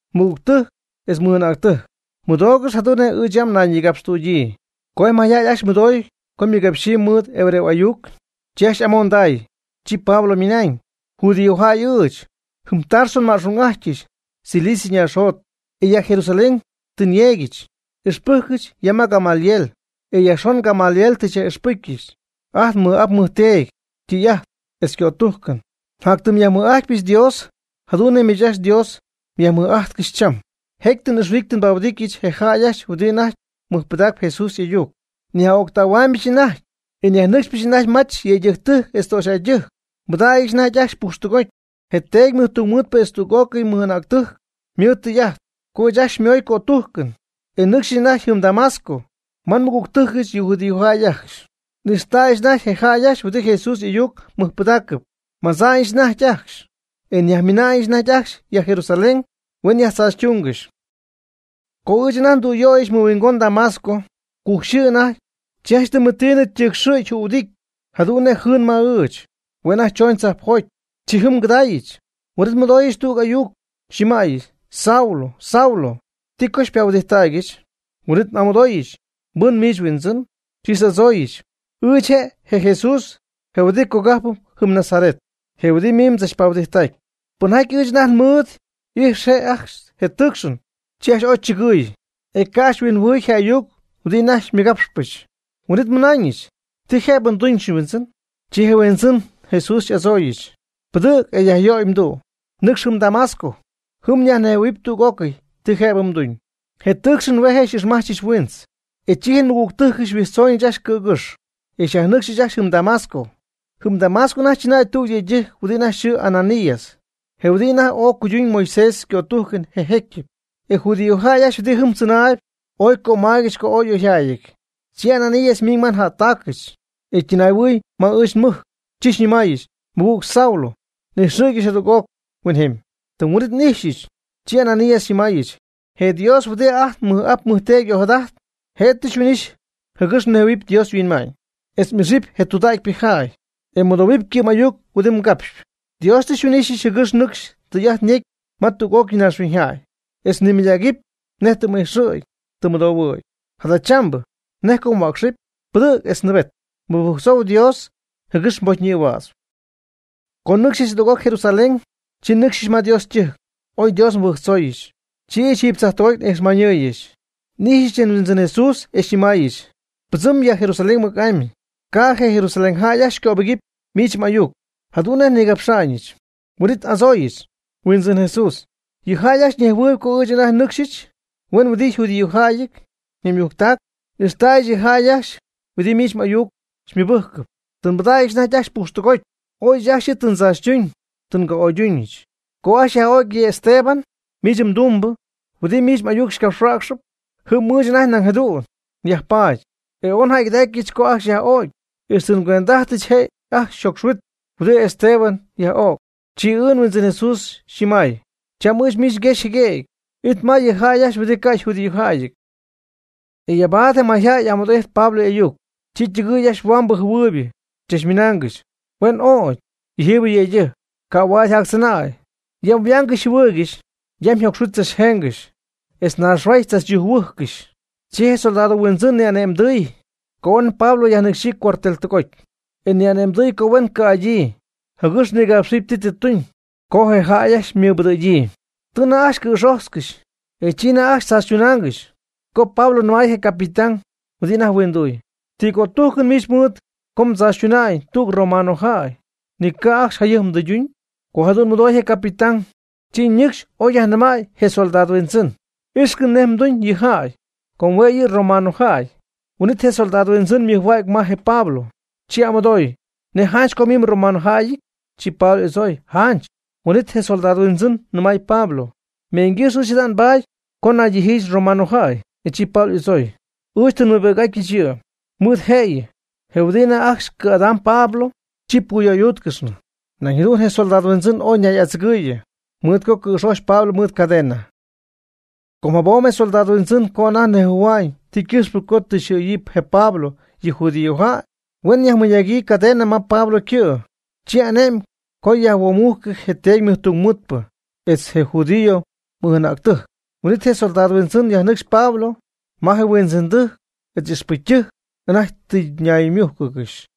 ―Mɨgügtɨjc etz mɨj'anäctɨjc, mɨdoogɨxy jadu'n nej ɨɨch yam nnayñïgapxtüdyii. Co je mayjäy ajcxy mɨdoy co ymɨgápxɨgɨxy mɨɨd hebreo y'ayuc, chi ajcxy y'amonday, chi Pablo ymɨnañ: ―Judíojäy ɨɨch. Jɨm Tarso nma'xung'ajtyɨch, Cilicia ñaaxjot. E ya Jerusalén tɨ nyeegyɨch. Ixpɨjcɨch ya ma Gamaliel, etz yajxon Gamaliel tɨ xyaj'ixpɨjcyɨch ajt nmɨj'ap nmɨjteedy ytɨy'ajt etz ycötújcɨn. Njatyɨm nyajmɨj'ajtpyɨch Dios jadu'n nej miich ajcxy Dios myajmɨj'ajtcɨxy cham. Jecy tɨ n'ixhuɨdity tɨ nbahuɨdityɨch je jäy ajcxy huɨdi anajty mɨjpɨdaacp Jesús y'ayuc, nyaj'öctähuaamyɨch anajty, e nyajnɨcxpyɨch anajty mach yëydɨjctɨjc etz töxyjäydɨjc, nbɨdägyɨch anajty ajcxy pujxtɨgoty. Je teedy mɨjtungmɨɨdpɨ etz tüg'ócɨy mɨj'anäctɨjc ymɨɨd tɨy'ajt, co ɨɨch ajcxy xymooyɨch cötujcɨn, e nnɨcxyɨch anajty jɨm Damasco ma nmɨgügtɨjcɨch yɨ judío jäy ajcxy. N'ixtäyɨch anajty je jäy ajcxy huɨdi Jesús y'ayuc mɨjpɨdaacɨp, madza'ñɨch anajty ajcxy, e nyajmiina'ñɨch anajty ajcxy ya Jerusalén huen yajtzaachytunggɨxy. Co ɨɨch anajty ndüyöyɨch mɨhuingon Damasco, cujc yxɨɨ anajty, chi janch tɨmɨtiinɨ ytɨɨcxɨ̈gy jühuɨdity jadu'n nej jɨɨn ma ɨɨch, hue' anajty chooñ tzajpjoty. Chi jɨm ngɨdaayɨch, huin'it nmɨdooyɨch tüg ayuc xyñɨmäyɨch: “Saulo, Saulo, ¿ti co xypahuɨdijttägyɨch?” Huin'it n'amɨdooyɨch: “¿Mbɨn miich, Huindzɨn?” Chi xy'adzooyɨch: “Ɨɨch je' je Jesús je huɨdi cogajp jɨm Nazaret, je huɨdi miich mdzachpahuɨdijttacpy.” Pɨnjaty ɨɨch anajty nmɨɨd y'ijx je' ajcxy je tɨɨcxɨn, chi ajcxy ooy chɨgɨɨy, e ca' ajcxy huinjɨhuɨɨy je ayuc huɨdi anajty nmɨgapxyiijɨch. Huin'it nnɨmaayɨch: “¿Ti jëbɨ nduñɨch, Huindzɨn?” Chi je Huindzɨn Jesús xy'adzooyɨch: “Pɨdɨ̈g e yajyöy mdu', nɨcxy jɨm Damasco, jɨm myajnɨmähuɨɨyb tüg'ócɨy ti jëbɨ mduñ.” Je tɨɨcxɨn hue' je' xy'ixmajchɨch huiintz. E chi je nmɨgügtɨjcɨch xyhuijtzoonɨch ajcxy cɨ̈gɨ́xy, xyajja'tyɨch ajcxy jɨm Damasco. Jɨm Damasco anajty chɨnäy tüg yëydɨjc huɨdi anajty yxɨɨ Ananías, je huɨdi anajty ooy cuyduñ Moisés ycötújcɨn je jécyɨp. E judíojäy ajcxy huɨdi jɨm tzɨnaayb ooy cömaaygɨxy co ooy y'oyjäyɨty. Chi Ananías ymiiñ ma njättaacɨch, e ytɨnay'ɨhuɨɨy ma ɨɨch nmɨjc, chi xyñɨmaayɨch: “Mɨgüg Saulo, ijxɨ̈gɨch jadüg'oc huinjemy.” Tɨm huin'ítɨy n'ijxɨ̈gyɨch. Chi Ananías xyñɨmaayɨch: “Je Dios huɨdi ajt nmɨj'ap nmɨjteedy ojadajt, je' tɨ xyhuin'ixy jɨgɨx mnejhuɨ̈huɨpy Dios yhuinma'ñ, etz m'ixɨpy je tudäcypɨ jäy, e mmɨdohuɨpy ycɨ'm ayuc huɨdi ycapxpy. Dios tɨ xyhuin'ixy jɨgɨx nɨcxy mdɨy'ajt yecy ma tüg'ócɨy naaxhuiñyjäy, etz mnimɨydägɨpy nej tɨ m'ixy tɨ mmɨdoy. Jadachambɨ, ¿nej co mhuäcxɨpy? Pɨdɨ̈g etz nɨɨbet. Mɨbɨjctzou Dios jɨgɨx mbocy ñïhuädzɨpy.” Co nɨcxnɨch jadüg'oc Jerusalén, chi nnɨcxɨch ma Dios ytɨjc, oy Dios nmɨbɨjctzooyɨch. Chi ɨɨch jiiby tzajtɨgoty n'ixmañyɨɨyɨch. N'ijxyɨch je Huindzɨn Jesús e xyñɨmaayɨch: “Pɨdzɨm ya Jerusalén mɨc'amy, ca' je Jerusalén jäy ajcxy cöbɨgɨpy miich m'ayuc jadu'n nej xyñigapxa'ñɨch.” Huin'it n'adzooyɨch: “Huindzɨn Jesús, yɨ jäy ajcxy ñejhuɨɨyb co ɨɨch anajty nnɨcxɨch huen huɨdi judíojäy naymujctac n'ixtäyɨch yɨ jäy ajcxy huɨdi miich m'ayuc xymɨbɨjcɨp, tɨ nbɨdägyɨch anajty ajcxy pujxtɨgoty, ooy ɨɨch ajcxy yɨ' tɨ ndzaachytuñ tɨ nga'oyduuñɨch. Co ajcxy yaj'ögy je Esteban, miich mdumbɨ, huɨdi miich m'ayuc xycapxhuäcxɨp, jɨm ɨɨch anajty nañ jadu'n yajpaady. E ooy njäygɨdacyɨch co ajcxy yaj'o'cy, ixtɨ ngüend'ajtɨch je' ajcxy yjocxhuit huɨdi Esteban yaj'o'c.” Chi ɨɨch nHuindzɨn Jesús xyñɨmay: “Cham ɨɨch miich nguexy jɨguëgy it ma yɨ jäy ajcxy huɨdi ca' yjudíojäyɨty.” E yabaad je mayjäy y'amɨdo'ijty Pablo y'ayuc, chi ytɨgɨɨy ajcxy huambɨ jɨhuɨɨybɨ chachmɨnaangɨxy: ―¡Huen öc yɨjiibɨ yëydɨjc! ¡Ca' huaad yjactzɨnäy! Yam yhuaangɨxy yjɨhuɨɨygɨxy, yam yjocxhuit tzachjengɨxy, etz naaxhuaay tzachyujc-huɨjcɨxy. Chi je soldado huindzɨn ni'ane'mdɨɨy co huen Pablo yajnɨcxyii cuartel tɨgoty, e ni'ane'mdɨɨy co huen cɨ'adyii jɨgɨx nigapxɨp ti tɨ tuñ co je jäy tɨ ymɨbɨdɨ̈gyii. Tɨ anajty ajcxy cɨ̈xojtzcɨxy, e chi anajty ajcxy tzaachytunaangɨxy co Pablo nɨmay je capitán huɨdi anajty huinduy: ―¿Ti cötújcɨn miich ajcxy mɨɨd co mdzaachytuna'ñ tüg romanojäy, ni ca' ajcxy jayɨjp mdɨyduñ? Co jadu'n mɨdooy je capitán, chi ñɨcxy oy yajnɨmäy je comandante: ―Ixcɨm nej mduñ yɨ jäy, com hue' yɨ' romanojäy. Huin'it je comandante ymɨjhuägy ma je Pablo, chi y'amɨdooy: ―¿Nej janch co miich mromanojäyɨty? Chi Pablo y'adzooy: ―Janch. Huin'it je comandante nɨmay Pablo: ―Meeñygɨ́xy ɨɨch jada nbaaty co naydijyiijɨch romanojäy. E chi Pablo y'adzooy: ―Ɨɨch tɨ nmɨɨbi'c'ajtɨch yɨ'. Mɨɨd jëyɨ, je huɨdibɨ anajty ajcxy cɨ̈'adam je Pablo, chi puyöydúutcɨxnɨ. Nañ jadu'n je comandante ooy ñay'adzɨgɨɨyɨ, mɨɨd co cɨ̈xojch Pablo mɨɨd cadena. Com jabom je comandante co anajty nejhuɨ̈hua'ñ ti ycɨxpɨ co tɨ yxɨ̈yii je Pablo yɨ judíojäy, huen yajmɨnagyii cadena ma Pablo ycɨ'. Chi ane'my co yajhuomujcɨ je teedy tungmɨɨdpɨ etz je judío mɨj'anäctɨjc. Huin'it je comandante yajnɨcxy Pablo ma je huindzɨndɨjc etz ixpɨcytɨjc anajty tɨ ñaymújcɨgɨxy.